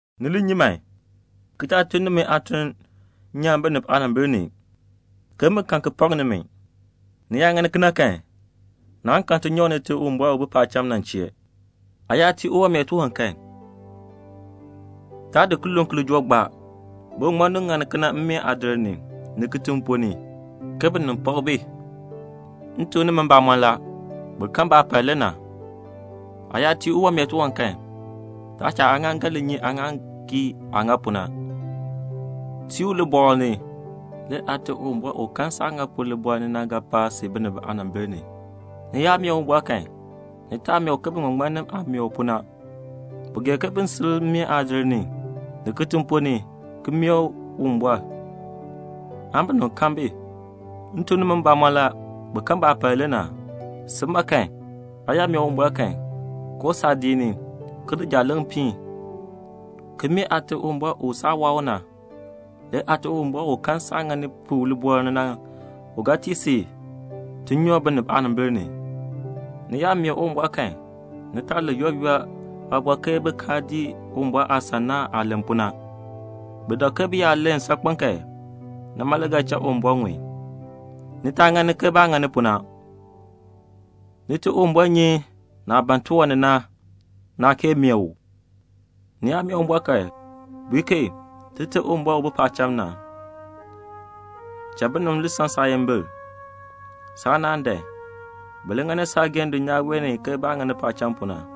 "Ni li nyi man, ki taa tun nimi aatuln nyaan binib aanimbil ni, ke bin kan ki pak nimi. Ni yaa ŋani kena kan, naan kan tinyoor Nite Uwumbɔr u bi paacham na chee. "Aa yaa tii uwanmeer tiwan kan, taa di kilooŋ ki li joo gbaa; biŋmaŋmannim ŋani kena mmeen aadir ni, ni kitiŋ ponn ni, ke binib n pak bi. M tuk nimi mbamɔn la, bi kan baapal le na. Aa yaa tii uwanmeer tiwan kan, taa cha aaŋaaŋgan li nyi aaŋaaŋgii aah ŋani pu na. Tiin u libɔɔl ni. Le Aate Uwumbɔr u kan saah ŋa pu na libɔɔl ni na, u ga pa si binib aanimbil ni." "Ni yaa mee Uwumbɔr kan, ni taa mee u ke biŋmaŋmannim na aah mee u pu na. Bi gee ke bin sil mmeen aadir ni, ni kitiŋ ponn ni ki mee Uwumbɔr, aan binib kan bi. M tuk nimi mbamɔn la, bi kan baapal le na. Si ma kan, aa yaa mee Uwumbɔr kan, koo saadiik ni, ki di jaaleŋ piin, ki mee Aate Uwumbɔr u saa waa u na. Le Aate Uwumbɔr u kan saah ŋani pu libɔɔl ni na, u ga tii si tinyoor binib aanimbil ni. "Ni yaa mee Uwumbɔr kan, ni taa len yooli yooli aaliin ke bin kaa dii Uwumbɔr aasan na aah len pu na. Bi dak ke bi yaa len saakpen kan, nima le ga cha Uwumbɔr ŋun. Ni taa ŋani ke baah ŋani pu na; Nite Uwumbɔr nyi naah ban tiwan ni na, naa kee mee u. Ni yaa mee Uwumbɔr kan, bui ke 'Tite Uwumbɔr u bi paacham na, binib n san saayimbil. Saanaan n dan. Bi li ŋani saageehn dulnyaa wee ni ke baah ŋani pu paacham na.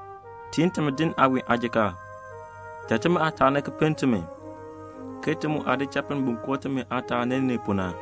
Tiin timi din aawiin aajikaar. Cha timi aataani ki pinn timi, ke ti mu aah di cha pinn bin koo timi aataani ni pu na.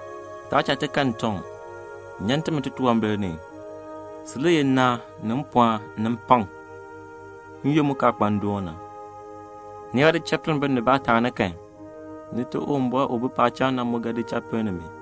Taa cha ti kan ntɔŋ. Nyan timi titunwambir ni. [Si le yeh nnaan ni mpɔɔn ni mpakm n-yoonn mu kaa kpa ndoon na.]' "Ni yaa di cha pinn binib baataani kan, Nite Uwumbɔr u bi paacham na mu ga di cha pinn nimi.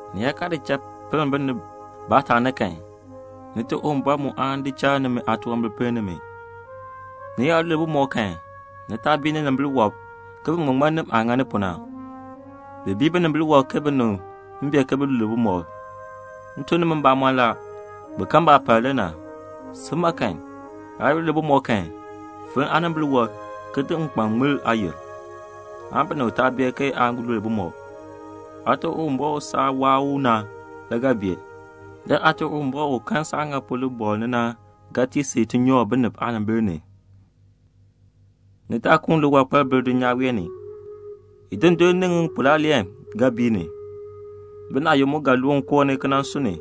Ni yaa kaa di cha pinn binib baataani kan, Nite Uwumbɔr mu aan di cha nimi aatunwambir pinn nimi." "Ni yaa lul bumɔb kan ni taa bii ninimbil wɔb ke biŋmaŋmannim aah ŋani pu na; bi bii binimbil wɔb ke binib n bee ke bi lul bumɔb. M tuk nimi mbamɔn la, bi kan baapal la. Si ma kan, aa yaa lul bumɔb kan, finn aanimbil wɔb, ki di nkpan ki ŋmir aayil pu, binib taa bee ke aa lul bumɔb. Aate Uwumbɔr u saa waa u na le ga bee. Le Aate Uwumbɔr u kan saah ŋa pu libɔɔl ni na, u ga tii si tinyoor binib aanimbil ni." "Ni taa di liwankpal ki kuun bil dulnyaa wee ni. Idundur ni ŋipulaaleen ga bii ni. Binaayukb mu ga loon koo ni ki nan sun ni.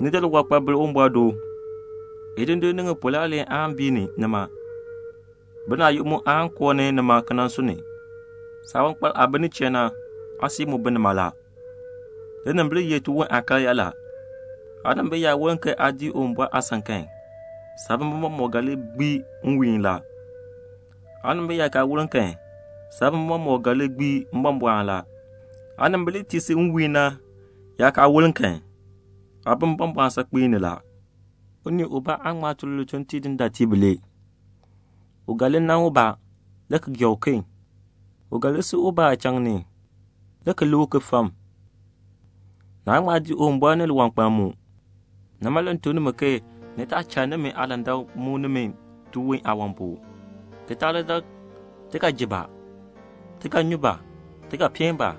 Ni di liwankpal ki di bil Uwumbɔr do. Idundur ni ŋipulaaleen aan bii ni nima. Binaayukb mu aan koo ni nima ki sun ni. Saawankpal aah bi nin chee na, aasui mu bi nima la." "Linimbil ye tiwon aakaryaa la. Aanimbil yaa woln ke aa dii Uwumbɔr aasan kan, saabimbin mɔmɔk ga li gbii nwiihn. Aanimbil yaa kaa woln kan, saabimbin mɔmɔk ga li gbii mbɔmbɔɔn. Aanimbil li tii si nwiihn na yaa kaa woln kan, aa bi mbɔmbɔɔn saakpen ni la." "Unii ubaa aan ŋma tun lituln ki tii dindaatiib bilee. U ga li nan ubaa, le ki li gee uken. U ga li si ubaa aachaŋ ni, le ki lik uken fam. Naan ŋma dii Uwumbɔr ni liwankpal mu. "Nima le m tuk nimi, ni taa cha nimi aalandak li muk nimi tiwon aawan pu, ki taa li dak: 'Ti ga ji ba? Ti ga nyu ba? Ti ga peen ba?'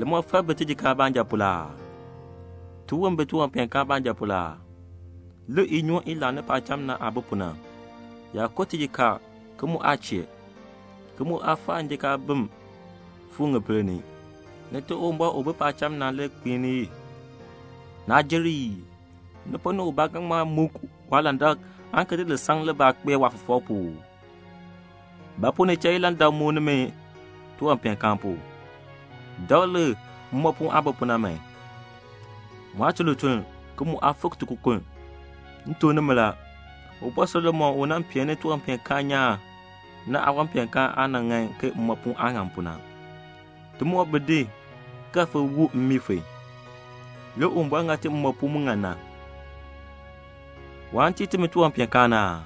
Limɔfal bi tijikaar baanja pu la aa? Tiwon bi tiwanpeenkaan baanja pu la aa? Lik inyoon i laani paacham na aah bi pu na. Yaa ko tijikaar ki mu aa chee, ki mu aa faa njikaabim ki fu ŋipil ni. Nite Uwumbɔr u bi paacham na le kpiin i. Naa jer ii? Ni ponn ni ubaa ga ŋma muk saalandak aan ki di lisaŋ libaa ki di kpee saafɔfɔk pu uu? "Ba pu ni cha ilandak li muk nimi tiwanpeenkaan pu? Dakl lik mmoopuun aah bi pu na. Mu aa tun lituln, ki mu aa fik tikokonn. M tuk nimi la, Ubɔr Solomon u nan pee tiwanpeenkaan nyaan na, waawanpeenkaan aa nan ŋan ke mmoopuun aah ŋan pu na. Timoor bi din ki ga fon see mmii fon, le Uwumbɔr ŋa ti mmoopuun mu ŋan na. Waan tii nimi tiwanpeenkaan aa?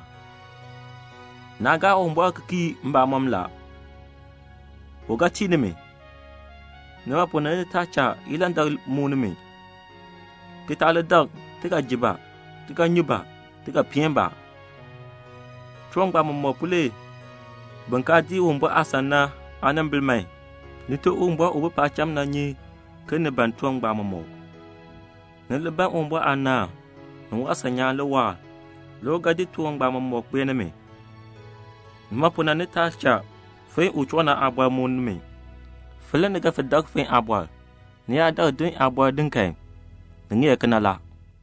Naa gaa Uwumbɔr ki kii mbamɔm. U ga tii nimi. Nima pu na ni taa cha ilandak li muk nimi, ki taa li dak: 'Ti ga ji ba? Ti ga nyu ba? Ti ga peen ba?' Tiwan ngbaan mɔmɔk pu le bin kaa dii Uwumbɔr aasan na aanimbil man. Nite Uwumbɔr u bi paacham na nyi ke ni ban tiwan ngbaan mɔmɔk. Ni li ban Uwumbɔr aanaan, ni waasan nyaan le waahr; le u ga di tiwan ngbaan mɔmɔk ki di kpee nimi. Nima pu na ni taa cha fon u choo na aabɔr li muk nimi. Fon le ni ga fon dak fon aabɔr. Ni yaa dakl din aabɔr din kan, ni ŋeer kena la."